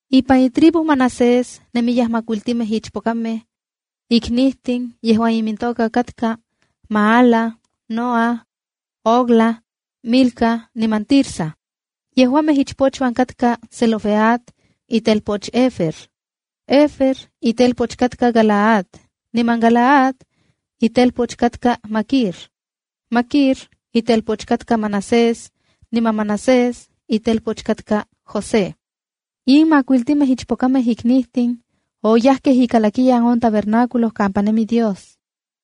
Ipan itribu Manasés nemiyaj makuiltimej ichpokamej iknijtin yejuan imintoka katka Maala, Noa, Hogla, Milca niman Tirsa. Yejuamej ichpochuan katkaj Zelofehad, itelpoch Hefer. (Hefer itelpoch katka Galaad, niman Galaad itelpoch katka Maquir, Maquir itelpoch katka Manasés, niman Manasés itelpoch katka José.) In makuiltimej ichpokamej iknijtin oyajkej ikalakiyan on tabernáculo kampa nemi Dios.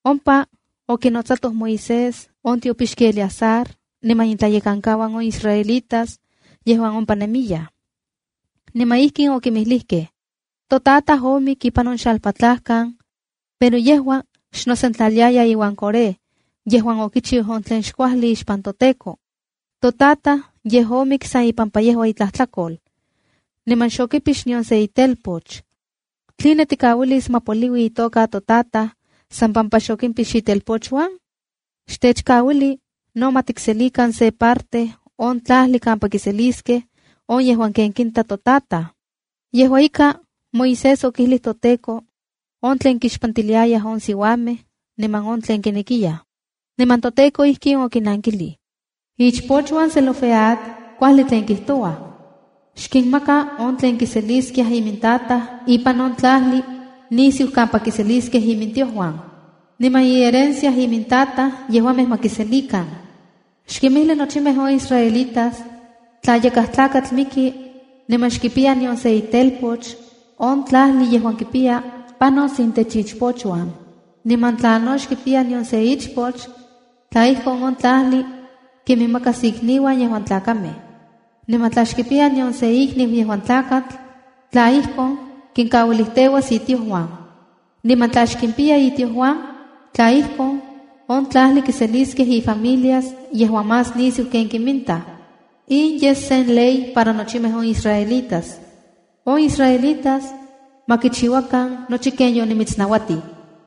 Ompa okinotsatoj Moisés, on tiopixki Eleazar, niman intlayekankauan on israelitas yejuan ompa nemiyaj. Niman ijkin okinmijlijkej: “Totataj omik ipan on xalpatlajkan, pero yejua xnosentlaliaya iuan Coré yejuan okichiu on tlen xkuajli ixpan toTEKO. Totataj yej omik san ipampa yejua itlajtlakol. Niman xokipix nion sen itelpoch. ¿Tline tikauilis ma poliui itoka totataj, san pampa xokimpix itelpochuan? Xtechkauili no ma tikselikan se parte on tlajli kampa kiseliskej on yejuan ken kinta totataj.” Yejua ika, Moisés okijlij toTEKO on tlen kixpantiliayaj on siuamej niman on tlen kinekiyaj. Niman toTEKO ijkin okinankilij: “Ichpochuan Zelofehad kuajli tlen kijtouaj. Xkinmaka on tlen kiseliskia imintataj ipan on tlajli nisiu kampa kiseliskej imintiojuan. Niman iherencia imintataj yeuajmej ma kiselikan. Xkinmijli nochimej on israelitas, tla yakaj tlakatl miki niman xkipiya nion sen itelpoch, on tlajli yejuan kipiya panos intech ichpochuan. Niman tla no xkipiya nion se ichpoch, tla ijkon, on tlajli kiminmakas ikniuan yejuan tlakamej. Niman tla xkipiya nion se ikniu yejuan tlakatl, tla ijkon, kinkauilijteuas itiojuan. Niman tla xkimpiya itiojuan, tla ijkon, on tlajli kiseliskej ifamilias yejuan más nisiu ken kiminta. In yes sen ley para nochimej on israelitas. On israelitas ma kichiuakan nochi ken yotimitsnauatij.”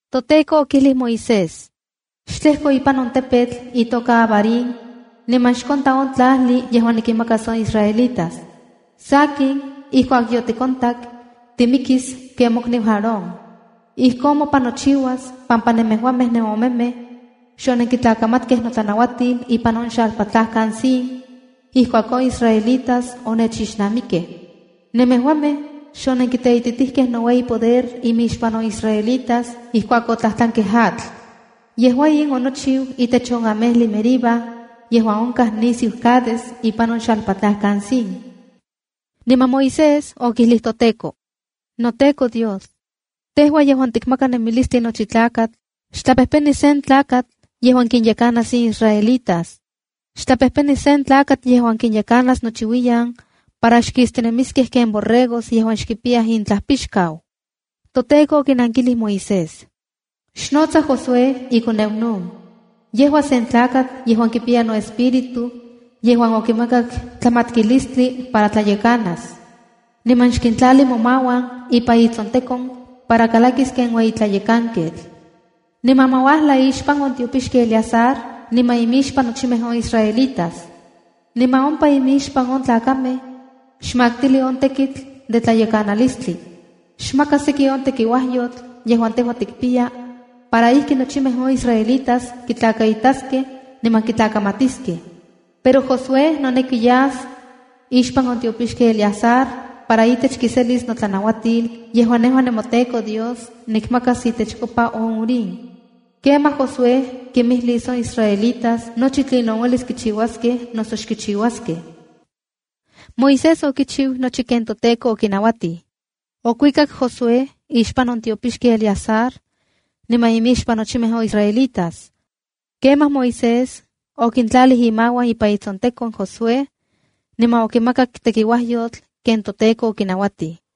ToTEKO okijlij Moisés: p —Xtlejko ipan on tepetl itoka Abarim niman xkonta on tlajli yejuan nikinmakas on israelitas. Sakin, ijkuak yotikontak, timikis ken mokniu Aarón. Ijkon mopan nochiuas pampa nemejuamej nenomemej xonenkitlakamatkej notlanauatil ipan on xalpatlajkan Zin, ijkuak on israelitas onechixnamikkej. Nemejuamej xonenkiteititijkej noueyipoder imixpan on israelitas ijkuak otlajtlankej atl. Yejua in onochiu itech on amejli Meriba yejuan onkaj nisiu Cades ipan on xalpatlajkan Zin. Niman Moisés okijlij toTEKO: —NoTEKO Dios, tejua yejuan tikmaka nemilistli nochi tlakatl, xtlapejpeni sen tlakatl yejuan kinyekanas in israelitas. Xtlapejpeni sen tlakatl yejuan kinyekanas nochiuiyan para xkistinemiskej ken borregos yejuan xkipiyaj intlajpixkau. ToTEKO okinankilij Moisés: —Xnotsa Josué, ikoneu Nun. Yejua sen tlakatl yejuan kipiya noEspíritu yejuan okimakak tlamatkilistli para tlayekanas. Niman xkintlali momauan ipan itsontekon para kalakis ken ueyi tlayekanketl. Niman ma uajla ixpan on tiopixki Eleazar niman inmixpan nochimej on israelitas. Niman ompa inmixpan on tlakamej, xmaktili on tekitl de tlayakanalistli. Xmaka seki on tekiuajyotl yejuan tejua tikpiya para ijki nochimej on israelitas kitlakaitaskej niman kitlakamatiskej. Pero Josué noneki yas ixpan on tiopixki Eleazar para itech kiselis notlanauatil, yejuan nejua nemoTEKO nikmakas itechkopa on Urim. Kemaj Josué kinmijlis on israelitas nochi tlinon uelis kichiuaskej noso xkichiuaskej. Moisés okichiu nochi ken toTEKO okinauatij. Okuikak Josué ixpan on tiopixki Eleazar niman inmixpan nochimej on israelitas. Kemaj Moisés okintlalij imauan ipan itsontekon Josué, niman okimakak tekiuajyotl ken toTEKO okinauatij.